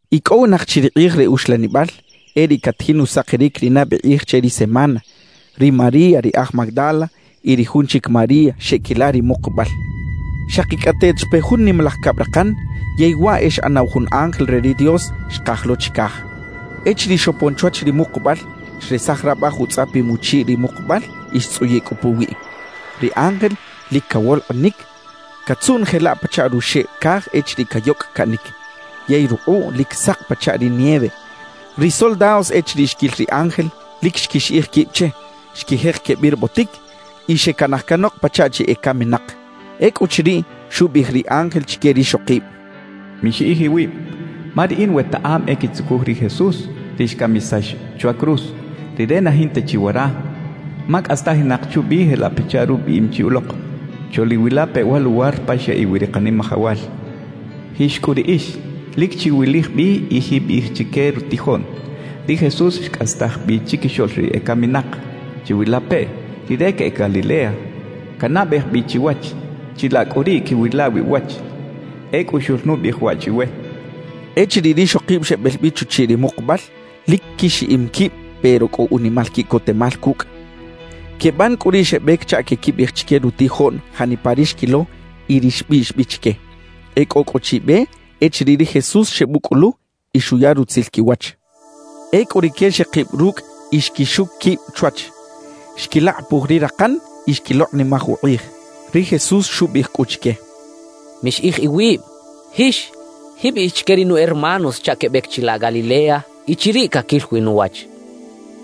Icꞌowinak chi ri kꞌij re uxlanibal, e riꞌ catajin usakiric ri nabe kꞌij che ri semana, ri María ri aj Magdala y ri jun chic María xeꞌquila ri mukubal. Xakicꞌateꞌt xpe jun nimalaj cabrakan, yey waꞌ e xꞌanaw jun ángel re ri Dios xkaj lo chicaj. Echiriꞌ xopon chwach ri mukubal, xresaj rabaj utzꞌapim uchiꞌ ri mukubal y xtzꞌuyiꞌ cꞌu puwiꞌ. Ri ángel lic cawolkꞌinic, catzuꞌn jelaꞌ pachaꞌ ruxeꞌ caj echiriꞌ cayocꞌ caꞌnic; yey rukꞌuꞌ lic sak pachaꞌ ri nieve. Ri soldados echiriꞌ xquil ri ángel, lic xquixiꞌij quib che; xquijek quebirbotic y xecanaj canok pachaꞌ chi ecaminak. Ecꞌuchiriꞌ, xubiꞌij ri ángel chique rixokib: —Mixiꞌij iwib. Ma riꞌin wetaꞌam e quitzucuj ri Jesús, ri xcamisax chwa cruz. Rire na jinta chi wara, ma cꞌastajinak chubi jelaꞌ pachaꞌ rubiꞌim chi ulok. Choꞌliwilape wa luwar pa xyaꞌiꞌ wi ri Kanimajawal. Jix cꞌu riꞌix, lic chiwilij bi y jiꞌbiꞌij chique rutijoꞌn: “Ri Jesús xcꞌastaj bi chiquixoꞌl ri ecaminak. Chiwilapeꞌ, Rire queꞌec Galilea, canabej bi chiwach; chilaꞌ cꞌu riꞌ quiꞌwila wi uwach.” Ecꞌu xoꞌlnubiꞌij waꞌ chiwe —xchaꞌ. Echiriꞌ rixokib xebel bi chuchiꞌ ri mukubal, lic quixiꞌim quib pero cꞌo unimal quiꞌcotemal cucꞌ. Queban cꞌu riꞌ xebec chaꞌ queꞌquibiꞌij chique rutijoꞌn janipa ri xquilo y ri xbiꞌx bi chique. E cꞌo cꞌu chi be echiriꞌ ri Jesús xebucꞌulu y xuya rutzil quiwach. Ecꞌu rique xekib rucꞌ y xquixuc quib chwach; xquilakꞌapuj ri rakan y xquilokꞌnimaj ukꞌij. Ri Jesús xubiꞌij cꞌu chique: —Mixiꞌij iwib. Jix, jiꞌbiꞌij chique ri nu hermanos chaꞌ quebec chilaꞌ Galilea y chiriꞌ caquil wi nuwach —xchaꞌ.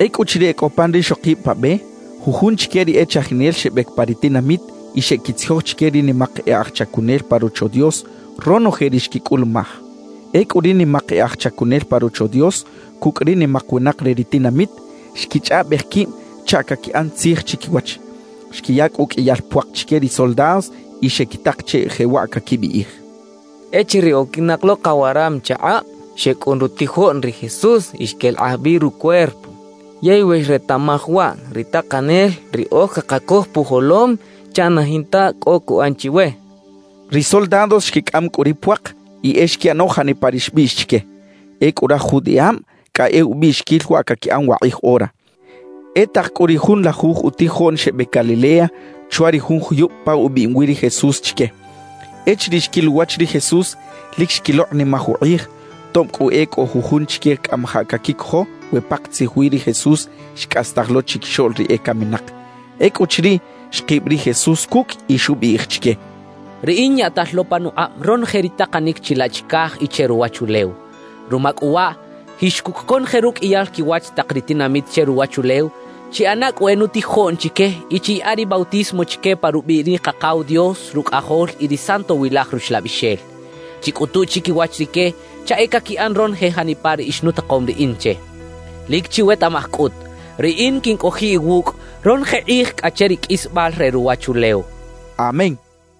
Ecꞌuchiriꞌ e cꞌo pan rixokib pa be, jujun chique ri e chajinel xebec pa ri tinamit y xeꞌquitzijoj chique ri nimak e aj chacunel pa Rocho Dios ronoje ri xquicꞌulumaj. Ecꞌu ri nimak e aj chacunel pa Rocho Dios cucꞌ ri nimak winak re ri tinamit, xquichꞌaꞌbej quib chaꞌ caquiꞌan tzij chiquiwach. Xquiya cꞌu uqꞌuiyal puak chique ri soldados y xequitak che jewaꞌ caquibiꞌij: «Echiriꞌ oquinak lo kawaram chakꞌab, xecꞌun rutijoꞌn ri Jesús y xquelakꞌaj bi rucuerpo. Yey we xretaꞌmaj waꞌ ri takanel, riꞌoj cakacoj pujolom chaꞌ na jinta cꞌo cuꞌan chiwe» quechaꞌ. Ri soldados xquicꞌam cꞌu ri puak y e xquiꞌano janipa ri xbiꞌx chique. Ecꞌu raj judiꞌab cꞌa e ubiꞌxiquil waꞌ caquiꞌan wakꞌij ora. E tak cꞌu ri junlajuj utijoꞌn xebec Galilea chwa ri jun juyub pa ubiꞌim wi ri Jesús chique. Echiriꞌ xquil uwach ri Jesús, lic xquilokꞌnimaj ukꞌij, tob cꞌu e cꞌo jujun chique cꞌamajaꞌ caquicojo we pakatzij wi ri Jesús xcꞌastaj lo chiquixoꞌl ri ecaminak. Ecꞌuchiriꞌ, xkib ri Jesús cucꞌ y xubiꞌij chique: —Riꞌin yaꞌtal lo panukꞌab ronoje ri takanic chilaꞌ chicaj y che ruwachulew. Ruma cꞌu waꞌ, jix cucꞌ conoje ruqꞌuiyal quiwach tak ri tinamit che ruwachulew, chiꞌana cꞌu e nutijoꞌn chique y chiyaꞌa ri bautismo chique pa rubiꞌ ri Kakaw Dios, Rucꞌajol y ri Santowilaj Ruxlabixel. Chicꞌutu chiquiwach rique chaꞌ e caquiꞌan ronoje janipa ri ixnutakom riꞌin che. Lic chiwetaꞌmaj cꞌut: Riꞌin quincꞌojiꞌ iwucꞌ ronoje kꞌij cꞌa che ri qꞌuisbal re ruwachulew —xchaꞌ. Amén.